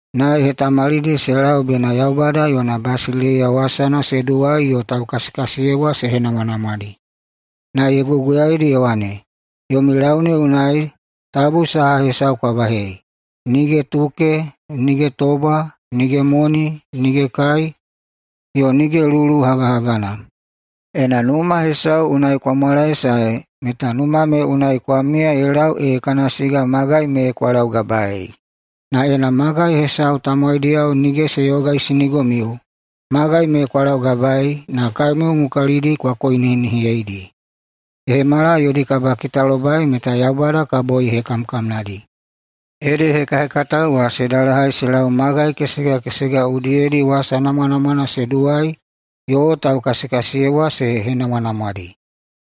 Na ye hetamalidi se lau bena Yaubada yona basileiya wasana se duwai yo taukasikasiyebwa se henamwanamwadi, na ye guguyaidi ye wane, “Yomi lau ne unai tabu saha hesau kwa bahei, nige tuke, nige tobwa, nige moni, nige kai, yo nige lulu hagahagana. Ena numa hesau unai kwa mwalaesae meta numa me unai kwa miya ye lau ee kana siga magai me kwa laugabaei. Na ena magai hesau tamowaidiyao nige se yogaisinigomiu, magai me kwa laugabaei na kaemiu mukalidi kwa koinihinihiyedi, ye hemala yodi kabakitalobai meta Yaubada kabo ye hekamkamnadi.” Ede hekahekatao wa se dalahai se lau magai kesega kesega udiyedi wasa namwanamwana se duwai yo taukasikasiyebwa se henamwanamwadi.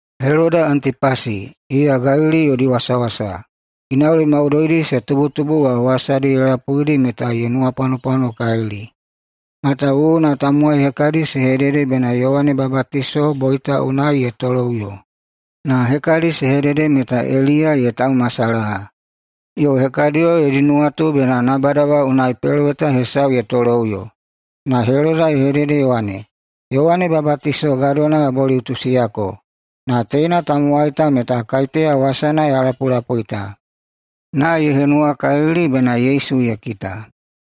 Heloda [Antipasi], iya Galili yodi wasawasa, ginauli maudoidi se tubutubu wa wasadi ye lapuidi meta ye nuwapwanopwanokalili, matawuwuna tamowai hekadi se hedede bena Yowane Babatiso boita unai ye toloꞌuyo, na hekadi se hedede meta Eliya ye taumasalaha, yo hekadiyo yodi nuwatu bena nabada wa unai peloweta hesau ye toloꞌuyo. Na Heloda ye hedede ye wane, “Yowane Babatiso gadona ya boliꞌutusiyako, na teina tamowai ta meta kaiteya, wasana ya lapulapui ta?” Na ye henuwakalili bena Yesu ye kita.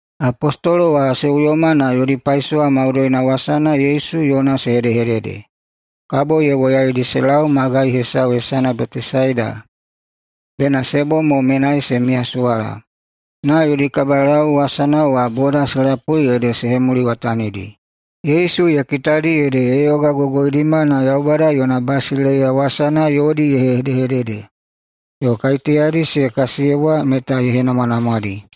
Apostolo wa se uyoma na yodi paisowa maudoina wasana Yesu yona se hedehedede. Kabo ye woyaidi se lau magai hesau hesana Betesaida, bena se bom mo menai se miyasuwala. Na yodi kabalau wasana wa boda se lapui ede se hemuliwatanidi. Yesu ye kitadi ede ye yogagogoidima na Yaubada yona basileiya wasana yodi ye hedehedede, yo kaiteyadi se kasiyebwa meta ye henamwanamwadi.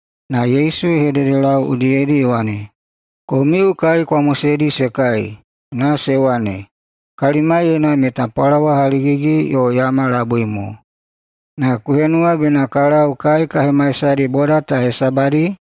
Na Yesu ye hededelau udiyedi ye wane, “Komiu kai kwa moseidi se kai.” Na se wane, “Kalimaiyena meta pwalawa haligigi yo yama labui mo. Na ku henuwa bena ka lau kai ka hemaisadi boda ta hesabadi?”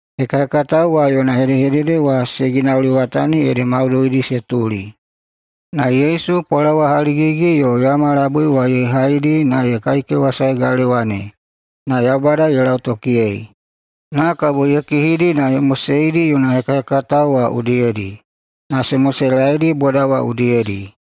Hekahekatao wa yona hedehedede wa se ginauliwatani ede maudoidi se tuli. Na Yesu pwalawa haligigi yo yama labui wa ye haidi na ye kaikewasae galewa ne, na Yaubada ye lautokiyei. Na kabo ye kihidi na ye moseidi yona hekahekatao wa udiyedi, na se moselaeidi boda wa udiyedi.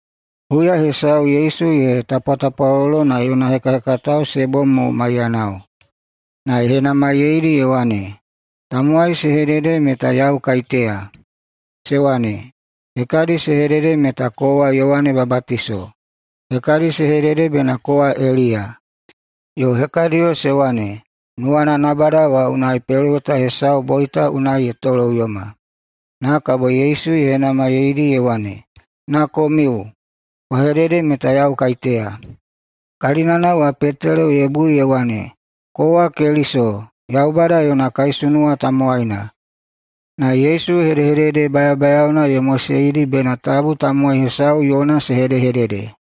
Huya hesau Yesu ye tapwatapwalolo na yona hekahekatao se bom mo maiyanao, na ye henamaiyeidi ye wane, “Tamowai se hedede meta yau kaiteya?” Se wane, “Hekadi se hedede meta kowa Yowane Babatiso, hekadi se hedede bena kowa Eliya, yo hekadiyo se wane, nuwana nabada wa unai peloweta hesau boita unai ye toloꞌuyoma.” Na kabo Yesu ye henamaiyeidi ye wane, “Na komiu? Kwa hedede meta yau kaiteya!” Kalinana wa Petelo ye bui ye wane, “Kowa Keliso, Yaubada yona kaisunuwa tamowaina!” Na Yesu hedehedede bayabayaona ye moseidi bena tabu tamowai hesau yona se hedehedede.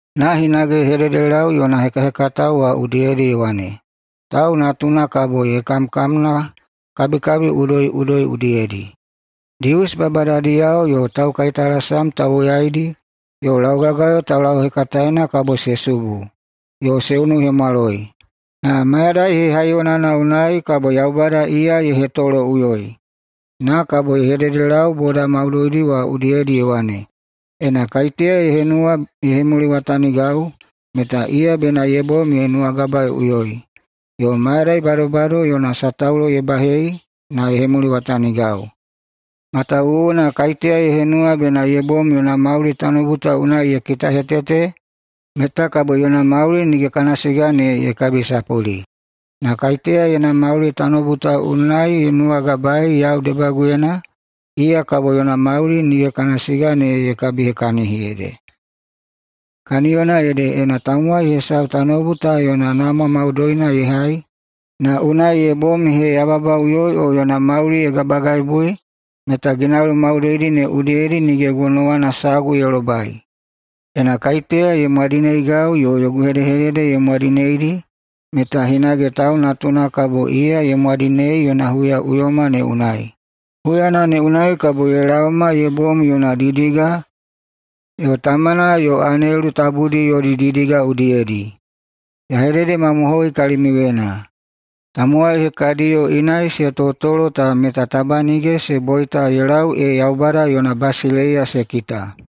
Na hinage ye hedehededelau yona hekahekatao wa udiyedi ye wane, “Tau Natuna kabo ye kamkamna kabikabi udoiꞌudoi udiyedi. Dius babadadiyao yo taukaitalasam tauwoyaidi yo laugagayo taulauhekataena kabo se subu, yo se unuhemwaloi, na mayadai hehaiyonana unai kabo Yaubada iya ye hetoloꞌuyoi.” Na kabo ye hedehededelau boda maudoidi wa udiyedi ye wane, “Ena kaiteya ye henuwa ye hemuliwatanigau, meta iya bena ye bom ye nuwagabaeꞌuyoi yo mayadai badobado yona sataulo ye bahei na ye hemuliwatanigau. Matawuwuna kaiteya ye henuwa bena ye bom yona mauli tanoubu ta unai ye kitahetete, meta kabo yona mauli nige kana siga ne ye kabisapuli. Na kaiteya yona mauli tanoubu ta unai ye nuwagabaei yau debaguyena, iya kabo yona mauli nige kana siga ne ye kabihekahini ede. Kaniyona ede, ena tamowai hesau tanoubu ta yona namwa maudoina ye hai, na unai ye bom ye heyababaꞌuyoi o yona mauli ye gabagaibui, meta ginauli maudoidi ne udiyedi nige gonowana sagu ye lobai. Ena kaiteya ye mwadineigau yo yogu hedehedede ye mwadineidi, meta hinage Tau Natuna kabo iya ye mwadinei yona huyaꞌuyoma ne unai. Huyana ne unai kabo ye laoma ye bom yona didiga yo tamana yo anelu tabudi yodi didiga udiyedi. Ya hededemamohoi kalimiuyena: Tamowai hekadiyo inai se totolo ta meta taba nige se boita ye lau ee Yaubada yona basileiya se kita.”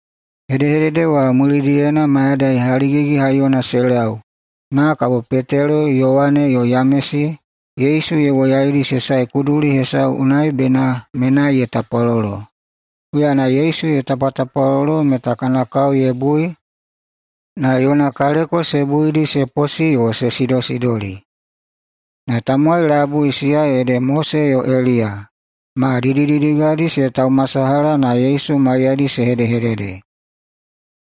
Hedehedede wa mulidiyena mayadai haligigi-haiyona se lau, na kabo Petelo, Yowane, yo Yamesi, Yesu ye woyaidi se sae kuduli hesau unai bena menai ye tapwalolo. Huyana Yesu ye tapwatapwalolo meta kana kao ye bui, na yona kaleko se buidi se posi yo se sidosidoli. Na tamowai labui, siya ede Mose yo Eliya, ma didididigadi se taumasalaha na Yesu maiyadi se hedehedede.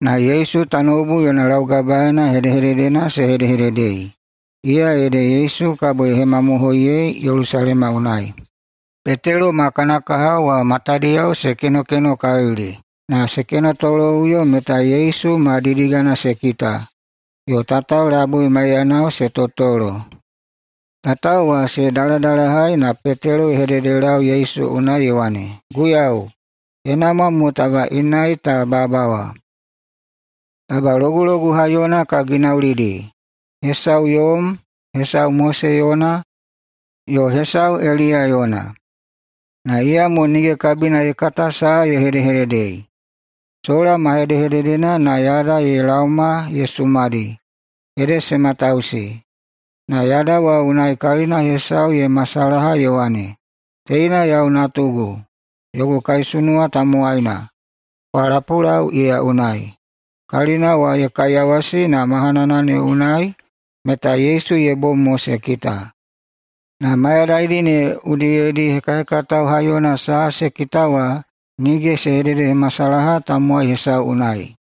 Na Yesu tanoubu yona laugabaeina hedehededena se hedehededei, iya ede Yesu kabo ye hemamohoiyei Yelusalema unai. Petelo ma kana kahao wa matadiyao se kenokenokalili. Na se kenotoloꞌuyo meta Yesu ma didigana se kita, yo tatao labui maiyanao se totolo. Tatao wa se daladalahai na Petelo ye hededelau Yesu unai ye wane, “Guiyau, ye namwa mo taba inai ta babawa. Taba logulogu haiyona ka ginaulidi, hesau yom, hesau Mose yona, yo hesau Eliya yona.” Na iyamo nige kabina ye kata saha ye hedehededei. Sola ma hedehededena na yada ye laoma na ye sumadi, ede se matausi. Na yada ne unai kalina hesau ye masalaha ye wane, “Teina yau Natugu, yogu kaisunuwa tamowaina. Kwa lapulau iya unai!” Kalina wa ye kaiyawasi, na mahanana ne unai meta Yesu ye bom mo se kita. Na mayadaidi ne udiyedi hekahekatao haiyona saha se kita wa nige se hededehemasalaha tamowai hesau unai.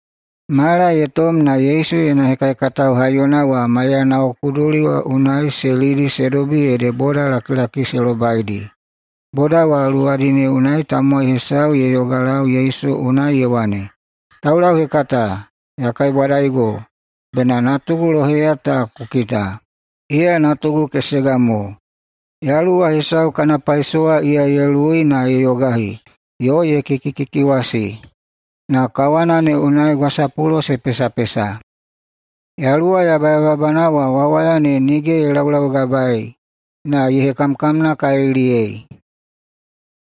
Mala ye tom na Yesu yona hekahekatao haiyona wa maiyanao kuduli wa unai se lidi se dobi ede bodalakilaki se lobaidi. Boda wa luwadi ne unai tamowai hesau ye yogalau Yesu unai ye wane, “Taulauhekata, ya kaibwadaigo bena natugu loheya ta ku kita! Iya natugu kesega mo. Yaluwa hesau kana paisowa iya ye luwui na ye yogahi, yo ye kikikikiwasi na kawana ne unai gwasapulo se pesapesa. Yaluwa yabayababana wa wawaya ne nige ye laulaugabaei na ye hekamkamnakaliliyei.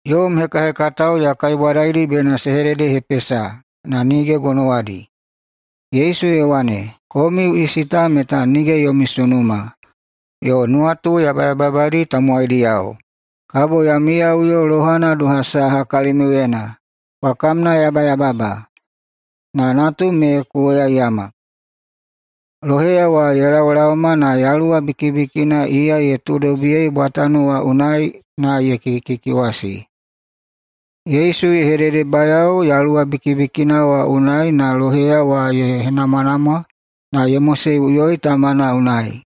Yom hekahekatao ya kaibwadaidi bena se hededehepesa, na nige gonowadi.” Yesu ye wane, “Komiu isi ta meta nige yomi sunuma, yo nuwatu yabayababadi tamowaidiyao. Kabo ya miyaꞌuyo lohana doha saha kalimiuyena? Kwa kamnayabayababa! Na natum me ku woyaiyama!” Loheya wa ye laolaoma na yaluwa bikibikina iya ye tuudobiyei bwatano wa unai na ye kikikikiwasi. Yesu ye hededebayao yaluwa bikibikina wa unai na loheya wa ye henamwanamwa na ye moseiꞌuyoi tamana unai.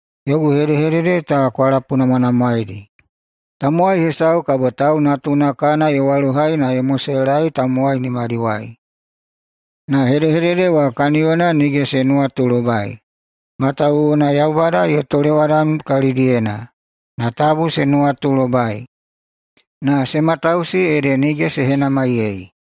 “Yogu hedehedede ta kwa lapunamwanamwaedi: Tamowai hesau kabo Tau Natuna kana ye walohai na ye moselaei tamowai nimadiwai.” Na hedehedede wa kaniyona nige se nuwatulobai, matawuwuna Yaubada ye tolewadam kalidiyena, na tabu se nuwatulobai. Na se matausi, ede nige se henamaiyei.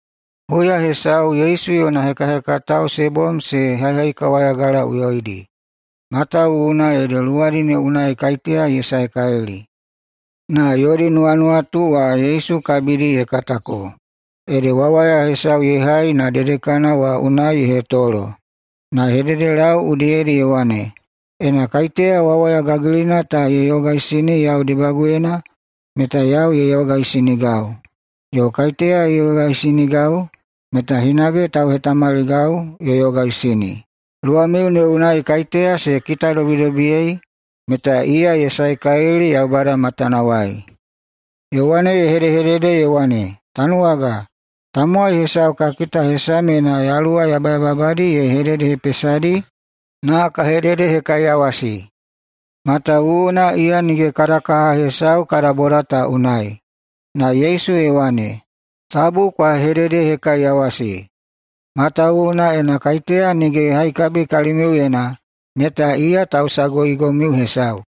Huya hesau Yesu yona hekahekatao se bom se haihaikawayagalaꞌuyoidi, matawuwuna ede luwadi ne unai kaiteya ye saekalili. Na yodi nuwanuwatu wa Yesu kabidi ye katako, ede wawaya hesau ye hai na dedekana wa unai ye hetolo. Na ye hededelau udiyedi ye wane, “Ena kaiteya wawaya gagilina ta ye yogaisini yau debaguyena, meta yau ye yogaisinigau. Yo kaiteya ye yogaisinigau, meta hinage tauhetamaligau ye yogaisini. Luwamiu ne unai kaiteya se kitadobidobiyei, meta iya ye saekalili Yaubada matanawai.” Yowane ye hedehedede ye wane, “Tanuwaga, tamowai hesau ka kita hesamyena yaluwa yabayababadi ye hededehepesadi, na ka hededehekaiyawasi, matawuwuna iya nige kada kaha hesau kada boda ta unai.” Na Yesu ye wane, “Tabu kwa hededehekaiyawasi, matawuwuna ena kaiteya nige ye haikabi kalimiuyena, meta iya tausaguigomiu hesau.”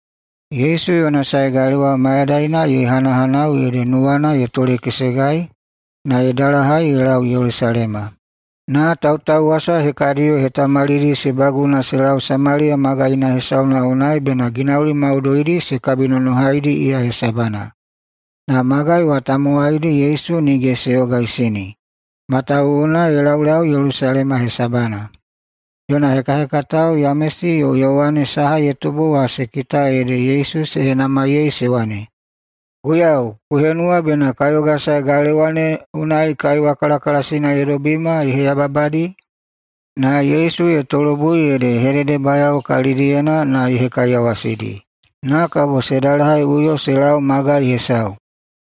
Yesu yona sae galewa mayadaina ye hanahanau ede nuwana ye tolekesegai na ye dalahai ye lau Yelusalema. Na tautauwasa hekadiyo ye hetamalidi se baguna se lau Samaliya magaina hesau unai bena ginauli maudoidi se nonohaidi iya hesabana. Na magai wa tamowaidi Yesu nige se yogaisini, matawuwuna ye laulau Yelusalema hesabana. Yona hekahekatao Yamesi yo Yowane saha ye tubu wa se kita ede Yesu se henamaiyei se wane, “Guiyau, ku henuwa bena ka yogasae galewa ne unai kaiwa kalakalasina ye dobima ye heyababadi?” Na Yesu ye tolobui ede ye hededebayao kalidiyena na ye hekaiyawasidi, na kabo se dalahaiꞌuyo se lau magai hesau.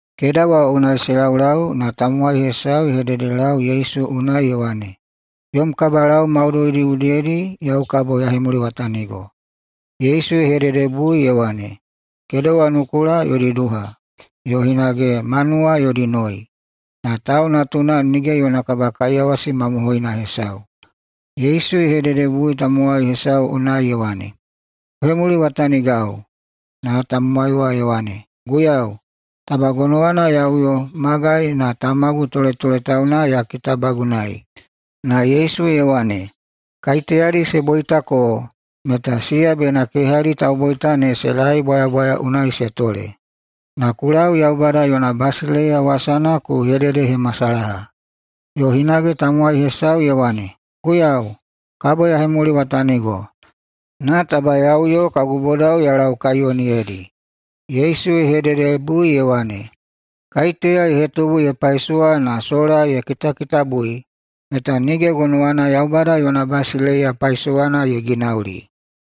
Keda wa unai se laulau, na tamowai hesau ye hededelau Yesu unai ye wane, “Yom kabalau maudoidi udiyedi yau kabo ya hemuliwatanigo.” Yesu ye hededebui ye wane, “Kedewa nukula yodi duha, yo hinage manuwa yodi noi, na Tau Natuna nige yona kabakaiyawasi mamohoina hesau.” Yesu ye hededelau tamowai hesau unai ye wane, “Ku hemuliwatanigau!” Na tamowai wa ye wane, “Guiyau, taba gonowana ya uyo magai na tamagu toletoletauna ya kitabagunai.” Na Yesu ye wane, “Kaiteyadi se boitako meta siya bena kehadi tauboita ne se lae bwayabwaya unai se tole, na ku lau Yaubada yona basileiya wasana ku hededehemasalaha.” Yo hinage tamowai hesau ye wane, “Guiyau, kabo ya hemuliwatanigo, na taba ya uyo kagu bodao ya laukaiyoniyedi.” Yesu ye hededebui unai ye wane, “Kaiteya ye hetubu ye paisowa na sola ye kitakitabui, meta nige gonowana Yaubada yona basileiya paisowana ye ginauli.”